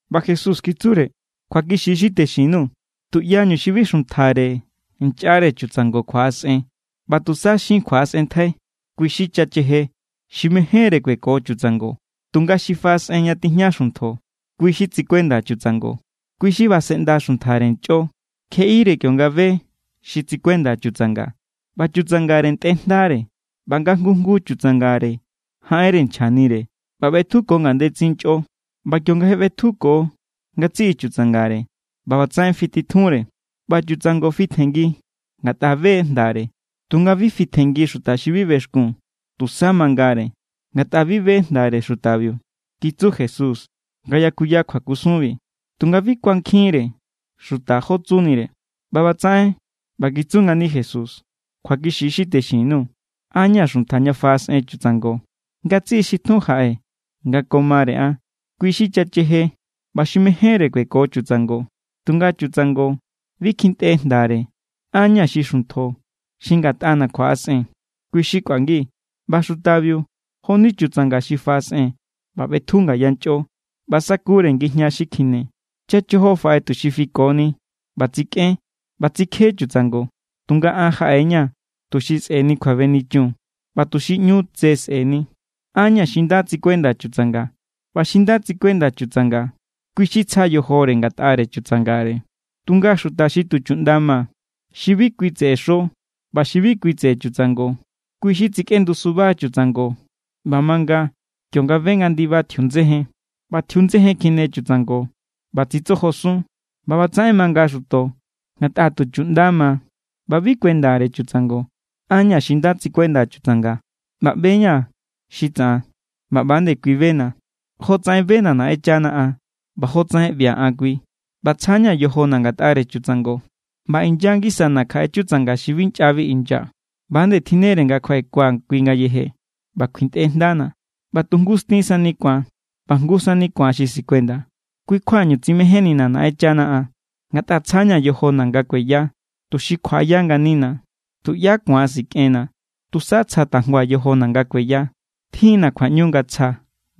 ꞌBa Jesús kitsure: —Kjuakixi= xi texin_nuu̱. Tuꞌyañu xi bi xuntjare nchꞌare chutsango kjuaꞌasꞌen ꞌba tusa xin kjuaꞌasꞌenntjai, kui= xi chacheje xi mejénre kueko chutsango. Tunga xi faꞌasꞌen ña tijña xuntjo, kui xi tsikuenda chutsango. Kui xi basenꞌnda xuntjare nchꞌo kjeꞌire kionga be xi tsikuenda chutsanga. ꞌBa chutsangare ntꞌe jndare, ꞌba nga jngu jngu chutsangare jaꞌenre nchjanire ꞌba ꞌbetjuko ngandetsin nchꞌo. ꞌBa kionga je ꞌbetjuko ngatsiꞌi chutsangare, ꞌba ꞌbatsaꞌen fititjunre, ꞌba chutsango fitjenngi ngatꞌa be= jndare. Tunga bi fitjenngi xuta xi bi bexkun. Tusa mangare, ngatꞌa bi be jndare xutabiu —kitsu Jesús nga yakuya kjuakusunbi, tunga bi kuankjinre xuta jó tsunire. ꞌBa ꞌbatsaꞌen ꞌba kitsu ngani Jesús: —Kjuakixi= xi texin_nuu̱. An= ña̱ xuntja ña faꞌasꞌen chutsango. Ngatsiꞌi xi tjun jaꞌe nga ko mare an, kui= xi chacheje ꞌba xi mejénre kueko chutsango. Tunga chutsango bi kjintꞌe jndare. An= ña̱ xi xuntjo. Xi ngatꞌana̱ kjuaꞌasꞌen, kui= xi kꞌuangi. ꞌBa xutabiu jo=ni chutsanga xi faꞌasꞌen ꞌba ꞌbetju ngaya nchꞌo ꞌba sakure ngijña xi kjine. ’Chachojo faꞌe tuxi fikoni ꞌba tsikꞌen ꞌba tsikje chutsango. Tunga an jaꞌe=ña̱ tuxi sꞌe̱ni kjuabenichun ꞌba tuxi ꞌnu tse sꞌe̱ni. An= ña̱ xi nda tsikuenda chutsanga. ꞌBa xi nda tsikuenda chutsanga, kui= xi tsja yojore ngatꞌare chutsangare. Tunga xuta xi tu chuꞌnda ma, xi bi kui tseꞌe xo ꞌba xi bi kui tseꞌe chutsango, kui= xi tsikꞌendu suba chutsango ꞌba manga kionga be nga ndiba tjiundsejen. ꞌBa tjiundsejen kjine chutsango ꞌba tsitsojosun. ꞌBa ꞌbatsaꞌen manga xuto ngatꞌa tu chuꞌnda ma ꞌba bi kuendare chutsango. ’An= ña̱ xi nda tsikuenda chutsanga. ꞌBa ꞌbe=ña̱ xi tsaꞌan ꞌba ꞌba nde kui bena̱, jotsaꞌen bena̱ Naꞌenchana an ꞌba jotsaꞌen ꞌbia̱ an kui. ꞌBa tsjana̱ yojona̱ ngatꞌare chutsango. ꞌBa inya ngisana̱ kjaꞌe chutsanga xi bi nchꞌabi inya. ꞌBa=nde tjinnere nga kjuaꞌekua̱ kui ngayeje, ꞌba kjuintꞌe jndana̱, ꞌba tu jngu stin sani ku̱an ꞌba jngu sani ku̱an xi sikuenda. ’Kui= kjuañu tsimejénnina̱ Naꞌenchana an, ngatꞌa tsjana̱ yojona̱ nga kueya, tuxi kjuaꞌaya nganina̱. Tuꞌyá ku̱an sikꞌenna̱. Tusa tsja tajngua̱ yojona̱ nga kueya. Tjin=na̱ kjuaꞌñu nga tsjaa̱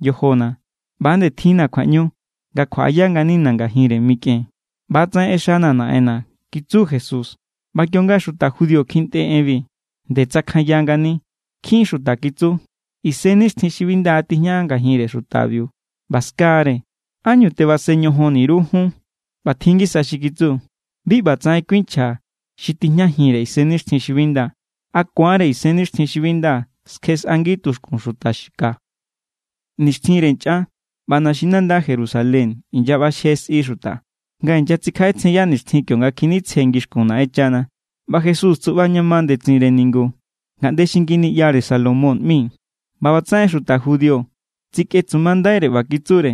yojona̱, ꞌba=nde tjinna̱ kjuaꞌñu nga kjuaꞌaya nganina̱ ngajinre mikꞌen. ꞌBa=tsaꞌen ꞌexana̱ Naꞌenna̱ —kitsu Jesús. ꞌBa kionga xuta judío kjintꞌe enbi, nde tsakjanya ngani. Nkjin xuta kitsu: —Isennixtjin xi bi nda tijña ngajinre xutabiu ꞌba ska=re. ¿Ánñu tebasen ñojonni_ru jun? ꞌBa tjin ngisa xi kitsu: —Bi ꞌbatsaꞌen kuinchja xi tijñajinre isennixtjin xi bi nda. ¿A ku̱anre isennixtjin xi bi nda skjexꞌangi tuxkun xuta ka? Nixtjinre nchꞌan ꞌba naxinanda Jerusalén inyaꞌbaxje sꞌi xuta, nga inyatsikjaꞌetsjenya nixtjin kionga kjinitsje ningu ngixkun Naꞌenchana. ꞌBa Jesús tsuꞌba ña ma ndetsinre ningu ngaꞌnde xi Nginiꞌyare Salomón ꞌmi. ꞌBa ꞌbatsaꞌen xuta judío tsikꞌetsumandaire ꞌba kitsure: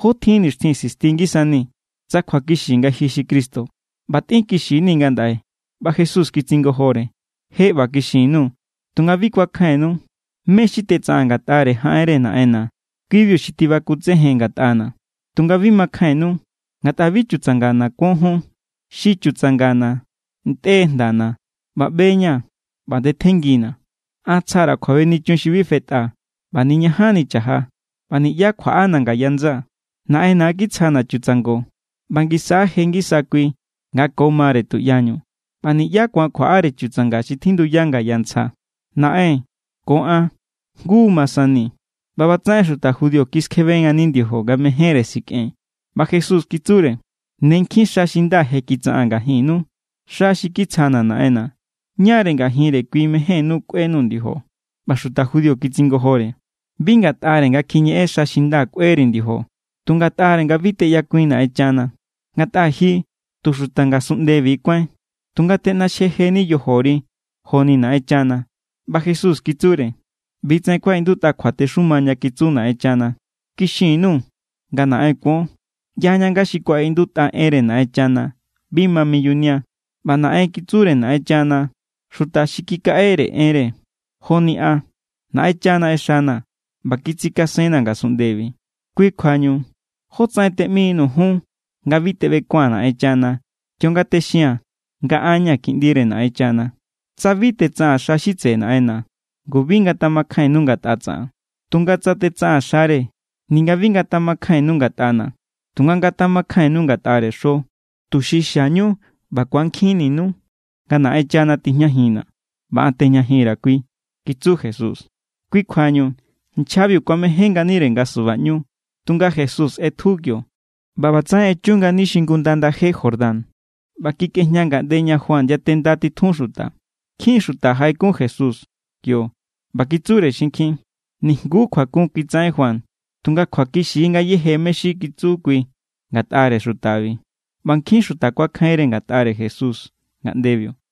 —¿Jó tjin nixtjin sisti ngisanii̱? Tsa kjuakixi nga ji xi Cristo, ꞌba tꞌinkixinii̱ ngandaꞌe. ꞌBa Jesús kitsingojore: —Je ꞌba kixin_nuu̱, tunga bi kuakjainnu. Mé xi tetsaꞌaa̱n ngatꞌare jaꞌenre Naꞌenna̱, ki=biu xi tibakutsejen ngatꞌana̱. Tunga bi makjainnu, ngatꞌa bi chutsangana̱ kuon jun. Xi chutsangana̱ ntꞌe= jndana̱, ꞌba ꞌbe=ña̱, ꞌba ndetjenngina̱. An tsja_ra̱ kjuabenichun xi bi fetꞌa ꞌba niñajanni cha̱ja. ꞌBa niꞌyá kjuaꞌana̱ ngaya ndsaa̱. Naꞌenna̱= kitsjana̱ chutsango ꞌba ngisa= je ngisa kui nga ko mare tuꞌyañu. ꞌBa niꞌyá ku̱an kjuaꞌare chutsanga xi tjindu ngaya ntsja. Naꞌen ko an jngu ma sani. ꞌBa ꞌbatsaꞌen xuta judío kiskjebe ngani ndiojo, nga mejénre sikꞌen. ꞌBa Jesús kitsure: —Ne nkjin xa xi nda je kitsaꞌaa̱n ngajinnu, xa xi kitsjana̱ Naꞌenna̱. ¿Ñáre ngajinre kui mejénnú kꞌuenuu̱ ndiojo? ꞌBa xuta judío kitsingojore: —Bi ngatꞌare nga kjiñeꞌen xa xi nda kꞌue_ri̱ ndiojo. Tu ngatꞌare nga bi teꞌyakuin Naꞌenchana. Ngatꞌa ji tu xuta ngasunꞌndebi= kuáin, tunga teꞌnaxjeni yojori joni Naꞌenchana. ꞌBa Jesús kitsure: —ꞌBi= tsaꞌen kuaꞌindutꞌa kjuatexumanu ña kitsu Naꞌenchana: “Kixin_nuu̱ nga naꞌen kuon.” ꞌYaña nga xi kuaꞌindutꞌa enre Naꞌenchana bi ma miyunia, ꞌba naꞌen kitsure Naꞌenchana xuta xi kikaꞌere enre. Joni an, Naꞌenchana ꞌexana̱ ꞌba kitsikasenna̱ ngasunꞌndebi. Kui kjuañu, ¿jótsaꞌen teꞌminuu̱ jun nga bi teꞌbekua̱n Naꞌenchana kionga texia̱n nga an= ña̱ Kiꞌndire Naꞌenchana? Tsa bi tetsaꞌaa̱n xa xi tseꞌe Naꞌenna̱, ngu bi ngatjamakjainnu ngatꞌa tsaꞌan. Tunga tsa tetsaꞌaa̱n xare, ninga bi ngatjamakjainnu ngatꞌana̱, tunga ngatjamakjainnu ngatꞌare xo, tuxi xiañu ꞌba ku̱ankjinninu nga Naꞌenchana tijñajinna̱ ꞌba an tejñajin_ra̱ kui —kitsu Jesús. Kui kjuañu nchjabiu kuamején nganire nga subaꞌñu, tunga Jesús ꞌetju kio. ꞌBa ꞌbatsaꞌen echu ngani xingunda ndaje Jordán ꞌba kikꞌejña ngaꞌnde ña Juan yatenda titjun xuta. Nkjin xuta jaꞌekun Jesús kio ꞌba kitsure xinkjin: —Nijnguú kjuakun kitsaꞌen Juan, tunga kjuakixi= ngayéje mé= xi kitsu kui ngatꞌare xutabi. ꞌBa nkjin xuta kuakjainre ngatꞌare Jesús ngaꞌndebiu.